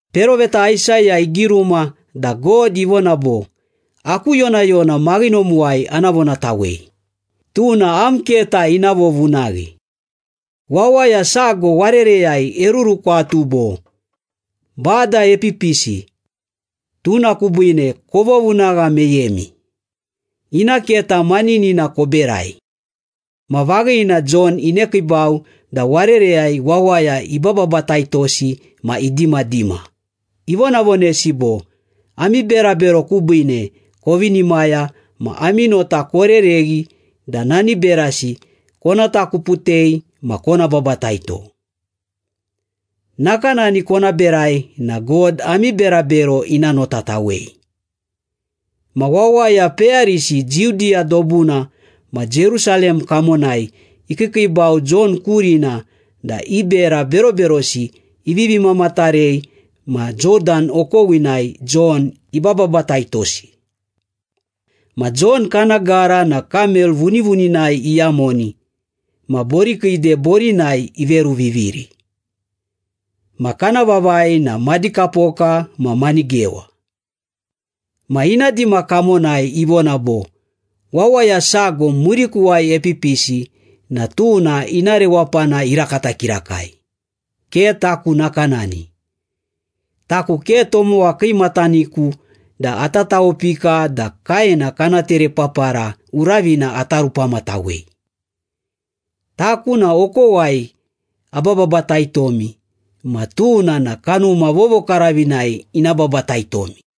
Peroveta Aisaya igiruma da God ivona bo, “Aku yonayona maghinomuwai ana vonatawei, Tuna am keta ina vovunaghi.” “Wawaya sago warereyai erurukwatu bo, ‘Bada epipisi, tuna kubiine kovovunagha meyemi, ina keta maninina koberai.’” Ma vaghina Jon inekiibau da warereyai wawaya ibababataitosi ma idimadima, ivonavonesi bo, “Ami berabero kubiine kovinimaya ma ami nota korereghi da nani berasi kona takuputei ma kona babataito. Nakanani kona berai na God ami berabero ina notatawei.” Ma wawaya peyarisi Judiya dobuna ma Jerusalem kamonai ikiikiibau Jon kurina da i bera beroberosi ivivi mamatarei ma Jodan okowinai Jon ibababataitosi. Ma Jon kana gara na kamel vunivuninai iyamoni ma borikiide borinai iveruviviri. Ma kana vavai na madikapoka ma manigewa. Ma ina dima kamonai ivona bo, “Wawaya sago murikuwai epipisi na tuna ina rewapana irakata kirakai, ke taku nakanani. Taku ke tomowa kiimataniku da ata tawopika da kaena kana terepapara uravina ata rupamatawei. Taku na okowai ababataitomi ma tuna na Kanuma Vovokaravinai ina babataitomi.”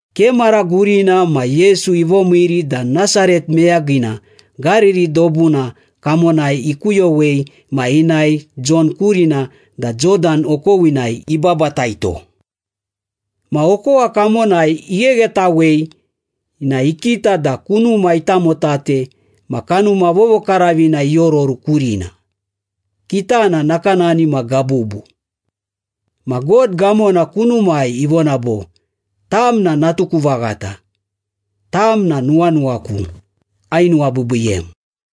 Ke mara gurina ma Yesu ivomiiri da Nasaret meyagina Gariri dobuna kamonai ikuyowei ma inae Jon kurina da Jodan okowinai ibabataito. Ma okowa kamonai igheghetawei na ikita da kunuma itamotate ma Kanuma Vovokaravina iororu kurina, kitana nakanani ma gabubu. Ma God gamona kunumai ivona bo, “Tam na natuku vaghata. Tam na nuwanuwaku, ainuwabiibiiyem.”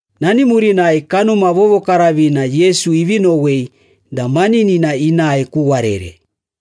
Nani murinai Kanuma Vovokaravina Yesu ivi nowei da maninina inae ku warere.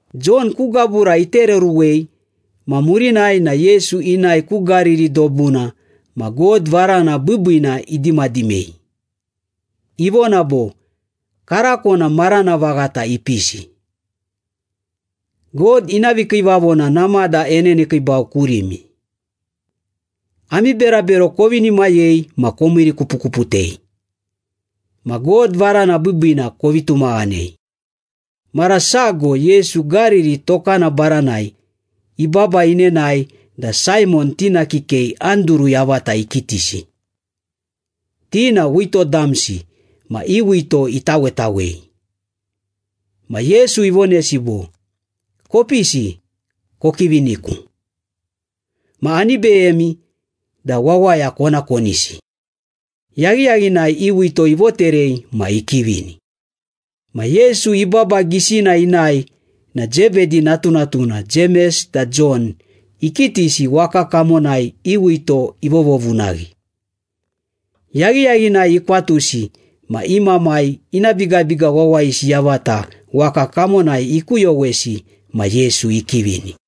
Jon ku gabura itereruwei ma murinai na Yesu inae ku Gariri dobuna ma God varana biibiina idimadimei. Ivona bo, “Karako na marana vaghata ipisi. God ina vikiivavona namada enenekiibau kurimi. Ami berabero kovinimayei ma komiirikupukuputei. Ma God varana biibiina kovi tumaghanei!” Mara sago Yesu Gariri tokana baranai ibaba inenae da Saimon tina kikei Anduru yavata ikitisi. Ti na wito damsi ma i wito itawetawei. Ma Yesu ivonesi bo, “Kopisi, kokiviniku. Ma ani beyemi da wawaya kona konisi.” Yaghiyaghinai i wito ivoterei ma ikivini. Ma Yesu ibaba gisina inae na Zebedi natunatuna Jemes da Jon ikitisi waka kamonai i wito ivovovunaghi. Yaghiyaghinai ikwatusi ma i mamai ina bigabiga wawayisi yavata waka kamonai ikuyowesi ma Yesu ikivini.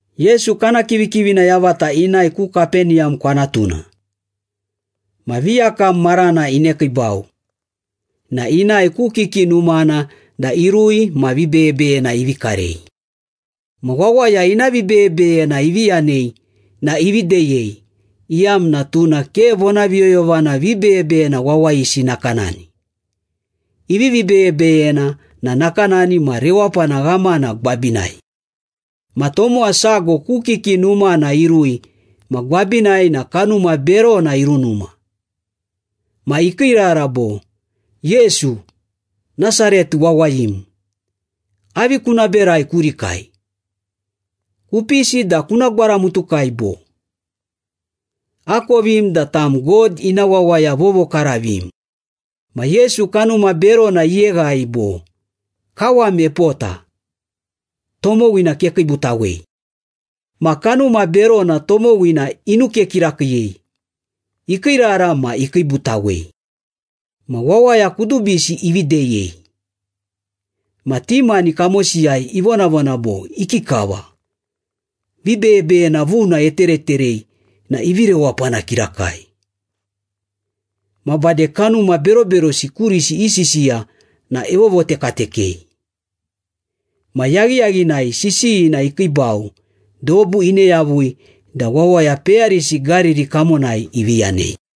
Yesu kana kivikivina yavata inae ku Kapeniyam kwanatuna. Ma viyakam marana inekiibau na inae ku kiki numana da irui ma vibeyebeyena ivi karei. Ma wawaya ina vibeyebeyena ivi yanei na ivi deyei, iyamna tuna ke vonaviyoyovana vibeyebeyena wawayisi nakanani. Ivivi beyebeyena na nakanani ma rewapana ghamana gwabinai. Ma tomowa sago ku kiki numana irui ma gwabinai na kanuma berona irunuma. Ma ikiirara bo, “Yesu, Nasaret wawayim! Avi kuna berai kurikai? Kupisi da kuna gwaramutukai, bo? Akovim da tam God ina wawaya vovokaravim!” Ma Yesu kanuma berona iyeghai bo, “Kawam epota. Tomowina kekiibutawei!” Ma kanuma berona tomowina inuke kirakiiyei, ikiirara ma ikiibutawei. Ma wawaya kudubisi ivi deyei. Ma ti mani kamosiyai ivonavona bo, “Ikikava? Vibeyebeyena vuna etereterei na ivi rewapana kirakai. Ma bade kanuma beroberosi kurisi isisiya na evovotekatekei!” Ma yaghiyaghinai sisiyina ikiibau, dobu ine yavui da wawaya peyarisi Gariri kamonai ivi yanei.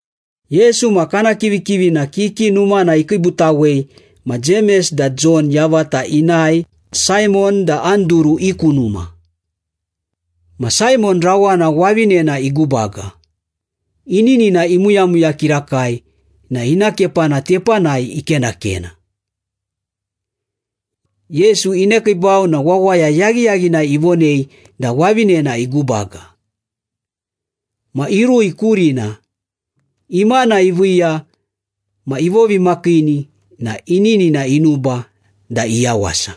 Yesu ma kana kivikivina kiki numana ikiibutawei ma Jemes da Jon yavata inae Saimon da Anduru i ku numa. Ma Saimon rawana wavinena igubaga, ininina imuyamuya kirakai na ina kepana tepanai ikenakena. Yesu inekiibau na wawaya yaghiyaghinai ivonei da wavinena igubaga. Ma irui kurina, imana iviiya ma ivovimakiini na ininina inuba da iyawasa.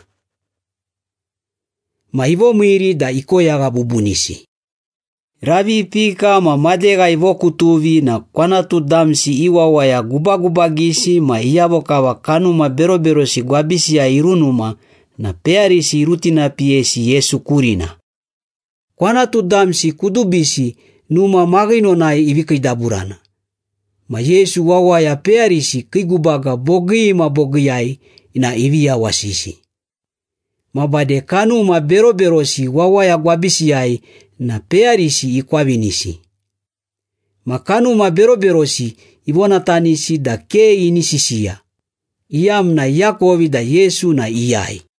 Ma ivomiiri da ikoyagha bubunisi. Ravi ipika ma madegha ivokutuvi na kwanatu damsi i wawaya gubagubagisi ma iyavo kava kanuma beroberosi gwabisiyai irunuma na peyarisi irutinapiyesi Yesu kurina. Kwanatu damsi kudubisi numa maghinonai ivi kiidaburana, ma Yesu wawaya peyarisi kii gubaga bogii ma bogiiyai na ivi yawasisi. Ma bade kanuma beroberosi wawaya gwabisiyai na peyarisi ikwavinisi. Ma kanuma beroberosi ivonatanisi da ke ini sisiya, iyamna iakovi da Yesu na iyai.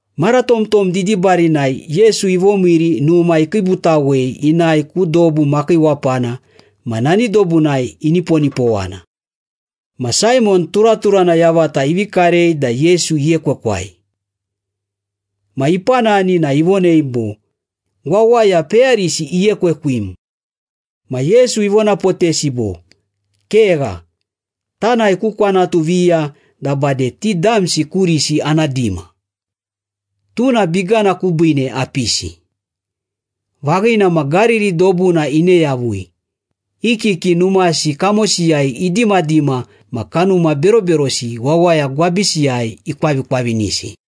Mara tomtom didibarinai Yesu ivomiiri numa ikiibutawei inae ku dobu makiiwapana ma nani dobunai iniponipowana. Ma Saimon turaturana yavata ivi karei da Yesu iekewekwai. Ma ipanani na ivonei bo, “Wawaya peyarisi iekwekwim.” Ma Yesu ivonapotesi bo, “Kegha, tanae ku kwanatu viya da bade ti damsi kurisi ana dima. Tuna bigana kubiine apisi.” Vaghina ma Gariri dobuna ine yavui, i kiki numasi kamosiyai idimadima ma kanuma beroberosi wawaya gwabisiyai ikwavikwavinisi.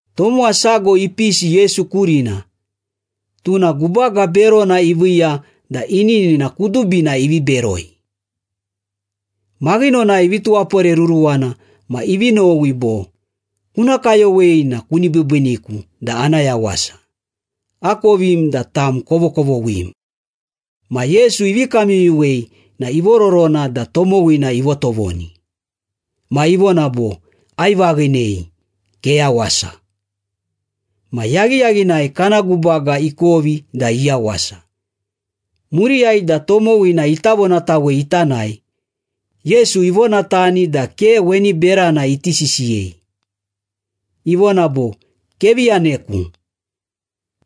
Tomowa sago ipisi Yesu kurina, tuna gubaga berona iviiya da ininina kudubina ivi beroi. Maghinonai ivi tuwaporeruruwana ma ivi nowi bo, “Kuna kayowei na kuni biibiiniku da ana yawasa. Akovim da tam kovokovoghim.” Ma Yesu ivi kamyuyuwei na ivororona da tomowina ivotovoni. Ma ivona bo, “Aivaghinei. Keyawasa.” Ma yaghiyaghinai kana gubaga ikovi da iyawasa. Muriyai da tomowina ita vonatawei ita nae, Yesu ivonatani da ke weni berana iti sisiyei. Ivona bo, “Kevi yaneku.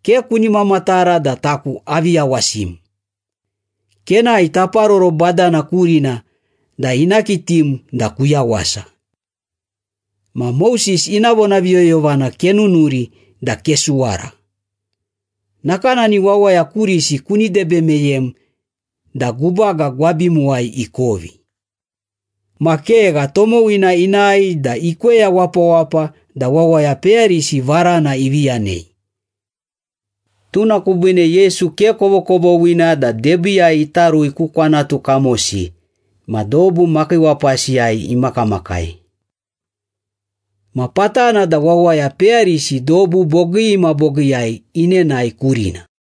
Ke kuni mamatara da taku avi yawasim. Kenae taparoro badana kurina da ina kitim da kuyawasa. Ma Moses ina vonaviyoyovana kenunuri da kesuwara. Nakanani wawaya kurisi kuni debe meyem da gubaga gwabimuwai ikovi.” Ma kegha, tomowina inae da ikweya wapawapa da wawaya peyarisi varana ivi yanei. Tuna kubiine Yesu ke kovokovoghina da debiiyai ita rui ku kwanatu kamosi ma dobu makiiwapasiyai imakamakai. Ma patana da wawaya peyarisi dobu bogii ma bogiiyai inenae kurina.